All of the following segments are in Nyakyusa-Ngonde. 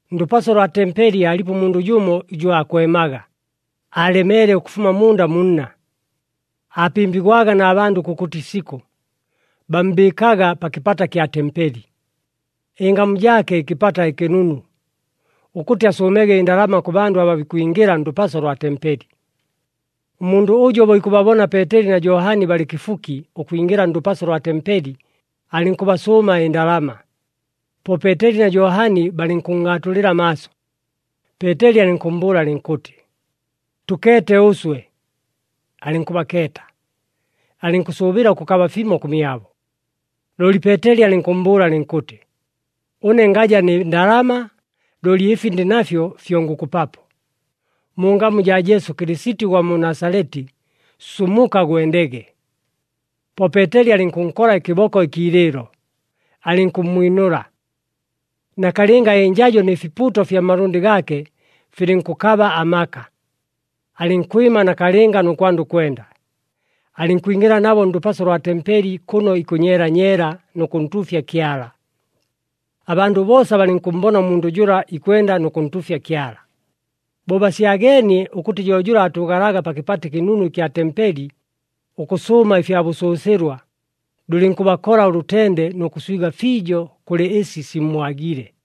Ndʉpaso lwa tempeli aalipo ʉmundʉ jʉmo ʉjʉ aakwemaga, aalemeele ʉkʉfuma munda mu nna. Aapɨmbigwaga na bandʉ kʉkʉtɨ isikʉ, bammbɨɨkaga pa kɨpata kya tempeli, ɨngamu jaake ɨKɨpata ɨKɨnunu, ʉkʉtɨ asʉʉmege ɨndalama kʉ bandʉ aba bikwingɨla ndʉpaso lwa tempeli. Ʉmundʉ ʉjo bo ikʉbabona Peeteli na Johani balɨ kɨfuki ʉkwingɨla ndʉpaso lwa tempeli, alɨnkʉbasʉʉma ɨndalama. Po Peeteli na Johani balɨnkʉnngʼaatulɨla amaaso, Peeteli alɨnkʉmmbʉʉla alɨnkʉtɨ, “Tʉkeete ʉswe!” Alɨnkʉbakeeta, alɨnkʉsʉʉbɨla ʉkʉkaba fimo kʉmyabo. Looli Peeteli alɨnkʉmmbʉʉla alɨnkʉtɨ, “Ʉne ngaja nɨ ndalama, looli ɨfi ndɨ nafyo fyo ngʉkʉpapo. Mu ngamu jaa Jesu Kɨlɨsiti ʉgwa mu Nasaleti, sumuka gwendege!” Po Peeteli alɨnkʉnkola ɨkɨboko ɨkiilɨɨlo, alɨnkʉmmwinʉla. Nakalɨnga ɨnjajo nɨ fipuuto fya malʉndɨ gaake filɨnkʉkaba amaka. Alɨnkwɨma nakalɨnga nʉ kwanda ʉkwenda, alɨnkwingɨla nabo ndʉpaso lwa tempeli kʉno ikʉnyeela nyeela nʉ kʉntuufya Kyala. Abandʉ boosa balɨnkʉmmbona ʉmundʉ jʉla ikwenda nʉ kʉntuufya Kyala. Bo basyageenie ʉkʉtɨ jo jʉla aatʉʉgalaga pa Kɨpata ɨKɨnunu ɨkya tempeli, ʉkʉsʉʉma ɨfya bʉsʉsɨlwa, lʉlɨnkʉbakola ʉlʉtende nʉ kʉswiga fiijo kʉlɨ ɨsi simmwagile.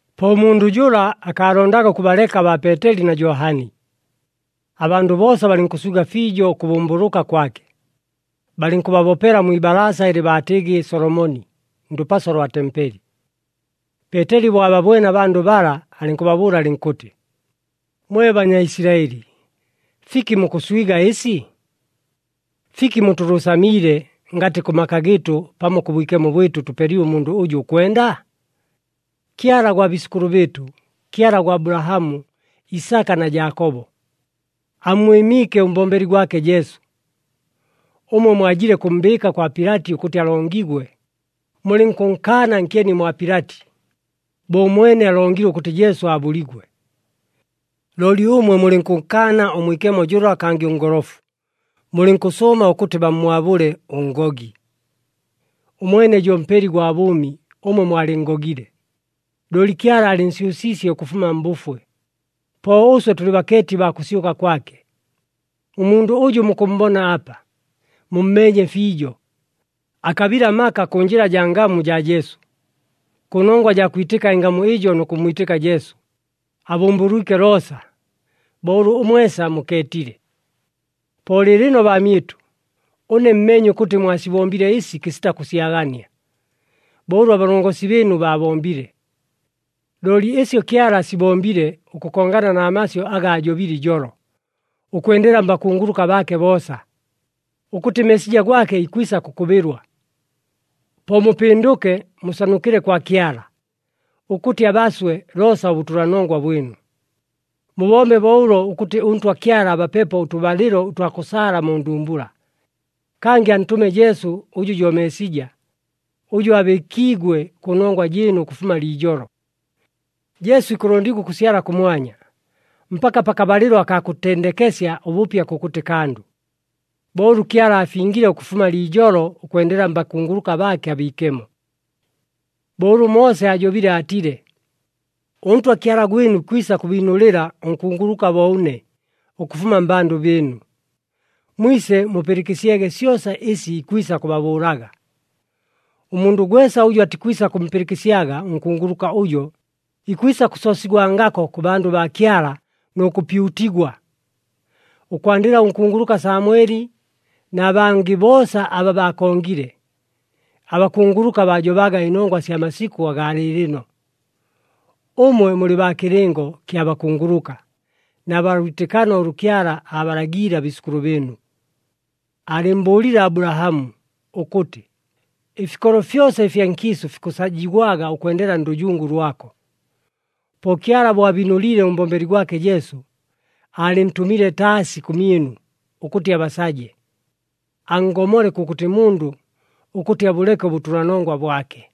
Po ʉmundʉ jʉla akaalondaga ʉkʉbaleka baa Peeteli na Johani. Abandʉ boosa balɨnkʉswiga fiijo ʉkʉbʉmbʉlʉka kwake, balɨnkʉbabopela mwi ibalaasa ɨlɨ baatɨgɨ Solomoni, ndʉpaso lwa tempeli. Peeteli bo ababwene abandʉ bala, alɨnkʉbabʉʉla alɨnkʉtɨ, “Mwe Banyaisilaɨli, fiki mukʉswiga ɨsi? Fiki mutʉlʉʉsamiile, ngatɨ kʉ maka gɨɨtʉ pamo kʉ bwikemo bwɨtʉ tʉpelile ʉmundʉ ʉjʉ ʉkwenda? Kyala gwa biisʉkʉlʉ bɨɨtʉ, Kyala gwa Abulahamu, Isaka na Jaakobo, ammwɨmiike ʉmbombeli gwake Jesu. Ʉmwe mwajile kʉmmbɨɨka kwa Pilati ʉkʉtɨ alongigwe, mulɨnkʉnkaana nkyeni mwa Pilati, bo ʉmwene alongile ʉkʉtɨ Jesu aabʉligwe. Looli ʉmwe mulɨnkʉnkaana ʉMwikemo jʉla kangɨ ʉNgolofu, mulɨnkʉsʉʉma ʉkʉtɨ bammwabʉle ʉngogi. Ʉmwene jo Mpeli gwa bʉʉmi, ʉmwe mwalɨnngogile. Looli Kyala aalɨnsyʉsiisye ʉkʉfuma mbʉfwe, po ʉswe tʉlɨ bakeeti baa kʉsyʉka kwake. Ʉmundʉ ʉjʉ mukʉmmbona apa, mummeenye fiijo. Akabile amaka kʉ njɨla jaa ngamu jaa Jesu. Kʉ nongwa jaa kwitɨka ɨngamu ɨjo nʉ kʉmmwitɨka Jesu, abʉmbʉlwike loosa, bo ʉlʉ mwesa mukeetile. “Po lɨɨlɨno baamyɨtʉ, ʉne mmeenye ʉkʉtɨ mwasibombile ɨsi kɨsita kʉsyagania, bo ʉlʉ abalongosi bɨɨnu baabombile. Looli ɨsyo Kyala asibombile ʉkʉkongana na masyʉ aga aajobile ijolo ʉkwendela mbakunguluka baake boosa, ʉkʉtɨ Meesija gwake ikwisa kʉkʉbɨlwa. Po mupɨndʉke, musanukɨle kwa Kyala, ʉkʉtɨ abaswe loosa ʉbʉtʉlanongwa bwɨnu. Mubombe bo ʉlo ʉkʉtɨ ʉNtwa Kyala abapepo ʉtʉbalɨlo ʉtwa kʉsaala mu ndumbula. Kangɨ antʉme Jesu ʉjʉ jo Meesija, ʉjʉ aabɨɨkiigwe kʉnongwa jɨɨnu ʉkʉfuma liijolo. Jesu ikʉlondigwa ʉkʉsyala kʉmwanya mpaka pakabalɨlo akaa kʉtendekesya ʉbʉpya kʉkʉtɨ kandʉ, bo ʉlʉ Kyala aafingile ʉkʉfuma liijolo ʉkwendela mbakunguluka baake abiikemo. Bo ʉlʉ Moose aajobile aatile, ‘ɄNtwa Kyala gwɨnu ikwisa kʉbiinʉlɨla ʉnkunguluka bo ʉne ʉkʉfuma mmbandʉ bɨɨnu. Mwise mupɨlɨkɨsyege syosa ɨsi ikwisa kʉbabʉʉlaga. Ʉmundʉ gwesa ʉjʉ atikwisa kʉmpɨlɨkɨsyaga ʉnkunguluka ʉjo, ikwisa kʉsoosigwangako kʉ bandʉ baa Kyala nʉ kʉpyutigwa.’ Ʉkwandɨla ʉnkunguluka Samweli na bangɨ boosa aba baakongile, abakunguluka baajobaga ɨnongwa sya masikʉ agaa lɨɨlɨno. Ʉmwe mulɨ baa kɨlɨngo kya bakunguluka na baa lwitɨkano ʉlʉ Kyala aabalagiile abiisʉkʉlʉ bɨɨnu. Aalɨmmbʉʉlile Abulahamu, ʉkʉtɨ, ‘Ɨfikolo fyosa ɨfya nkiisʉ fikʉsajigwaga ʉkwendela ndʉjungu lwako.’ Po Kyala bo abiinʉliile ʉmbombeli gwake Jesu, aalɨntʉmile taasi kʉmyɨnu ʉkʉtɨ abasaje, anngomole kʉkʉtɨ mundʉ ʉkʉtɨ abʉleke ʉbʉtʉlanongwa bwake.”